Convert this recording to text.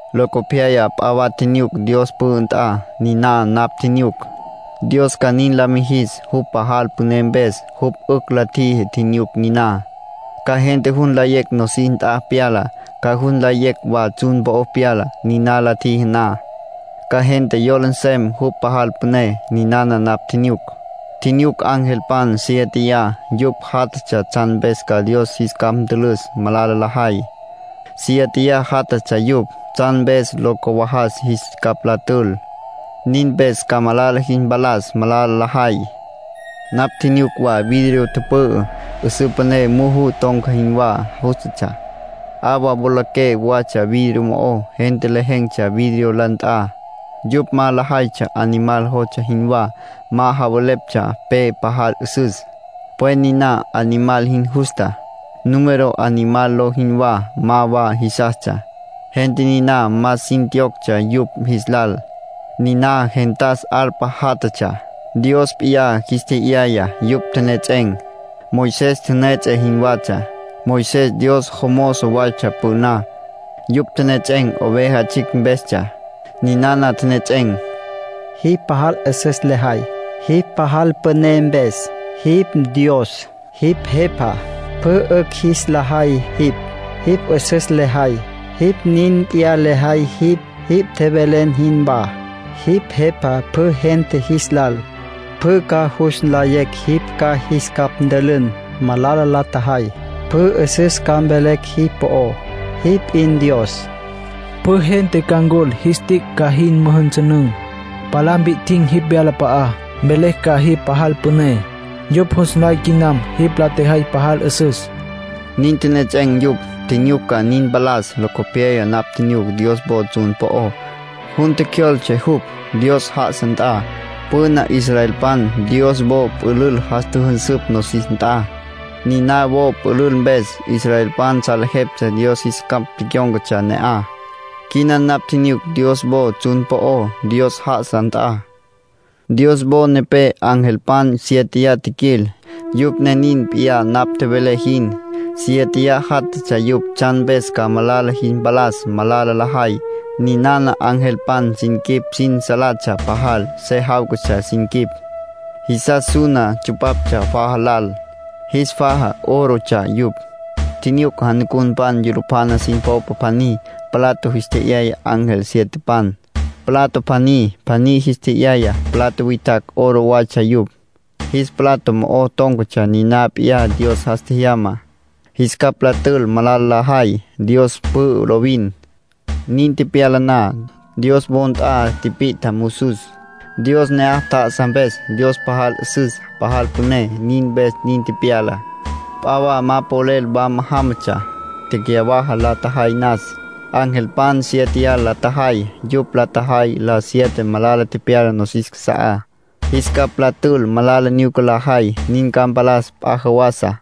Locopyaya p'a wa tjinyuc Dios pü'ü nt'a. Niná napj tjinyuc, Dios ca nin la mijis, jupj pajal püné mpes. Jupj 'ücj la tjiji tjinyuc niná, ca gente jus nlayecj nosis nt'a pyalá, ca jus nlayecj wa tsjun po'o pyalá. Niná la tjiji na, ca gente yola nsem jupj pajal püné. Ninana napj tjinyuc: tjinyuc angelpan siéteya. Yupj jatatsja tsjan mpes ca Dios jis capj ntülüs malala lajay. Siéteya jatatsja yupj, tsjan mpes lo cawajas jis capj la tül. Nin mpes ca malala jis mpalas malala lajay. Napj tjinyuc wa vidrio tüpü'ü, 'üsǘ püné muju ton̈ca jinwá jústatsja. 'Awa wolaqué watsja vidrio mo'ó. Gente lejen̈tsja vidrio la nt'a. Yupj ma lajaytsja Animal jostsja jinwá, ma javeleptsja pe pajal 'üsüs, pwen niná Animal jin justá. Número Animal ló jinwá, ma wa jisastsja. Gente niná más sin tjiyoctsja yupj jis lal. Niná gentas arpa jatatsja, Dios p'iyá jis tje'yayá. Yupj tjenejets'en̈, Moisés tjünüejets'e jinwatsja. (Moisés Dios jomozo waytsja püná.) Yupj tjenejets'en̈, Oveja Tsjicj mpestsja. Ninana tjenejets'en̈: “Jipj pajal 'üsüs lejay, jipj pajal püné mpes. Jipj Dios, jipj Jepa. Pjü 'ücj jis la jay jipj. Jipj 'üsüs lejay. Nin p'iyá lejay jipj, jipj tjevelen jinwá. Jipj Jepa pjü gente jis lal. Pjü ca jus nlayecj jipj ca jis capj ntülün malala la tjajay. Pjü 'üsüs ca mvelecj jipj po'ó. Jipj p'in Dios. Pjü gente ca ncul, jis tic' ca jin müjünsünün̈, palá mpi'tjin̈ jipj wyalap'a'á, mvelecj ca jipj pajal püné. Yupj jus nlay quinam jipj la tjejay pajal 'üsüs.” Nin tjenejets'en̈ yupj. Tjinyuc ca nin mpalas. Locopyaya napj tjinyuc Dios wo tsjun po'ó; jun tjecjyoltse jupj, Dios já'asa nt'a. Püna israelpan Dios wo pülül jas tjüjünsüpj nosis nt'a. Niná wo pülül mpes, israelpan salejeptsja Dios jis capj tecyón̈catsja ne'aj. Quina napj tjinyuc Dios wo tsjun po'ó, Dios já'asa nt'a. Dios wo nepé angelpan siéteya tjiquil. Yupj ne nin p'iyá napj tjevelé jin. Siéteya jatatsja yupj tsjan mpes ca malala jis mpalas malala lajay. Ninana angelpan sin quip sin salatsja pajal. Se jáwcatsja sin quip. Jisas suna tsupaptsja faja lal, jis faja órotsja yupj. Tjinyuc janucunpan yulupjana sin popa pjaní, plato jis tje'yaya ángel sietepan. Plato pjaní pjaní jis tje'yaya. Plato witjacj oro watsja yupj. Jis plato mo'o tón̈catsja niná p'iyá Dios jas tjejyama, jis capj la tül malala lajay. Dios pü'ü lovin. Nin tepyala na, Dios wo nt'a tipit'a musus, Dios ne'aj tjá'asa mpes. Dios pajal 'üsüs, pajal püné, nin mpes nin tepyala. P'a wa ma polel wama jámatsja, tecyawaja la tjajay nas, angelpan siéteya la tjajay. Yupj la tjajay la siete malala tepyala nosis casa'á, jis capj la tül malala nyuca lajay. Nin ca mpalas p'a jawasa.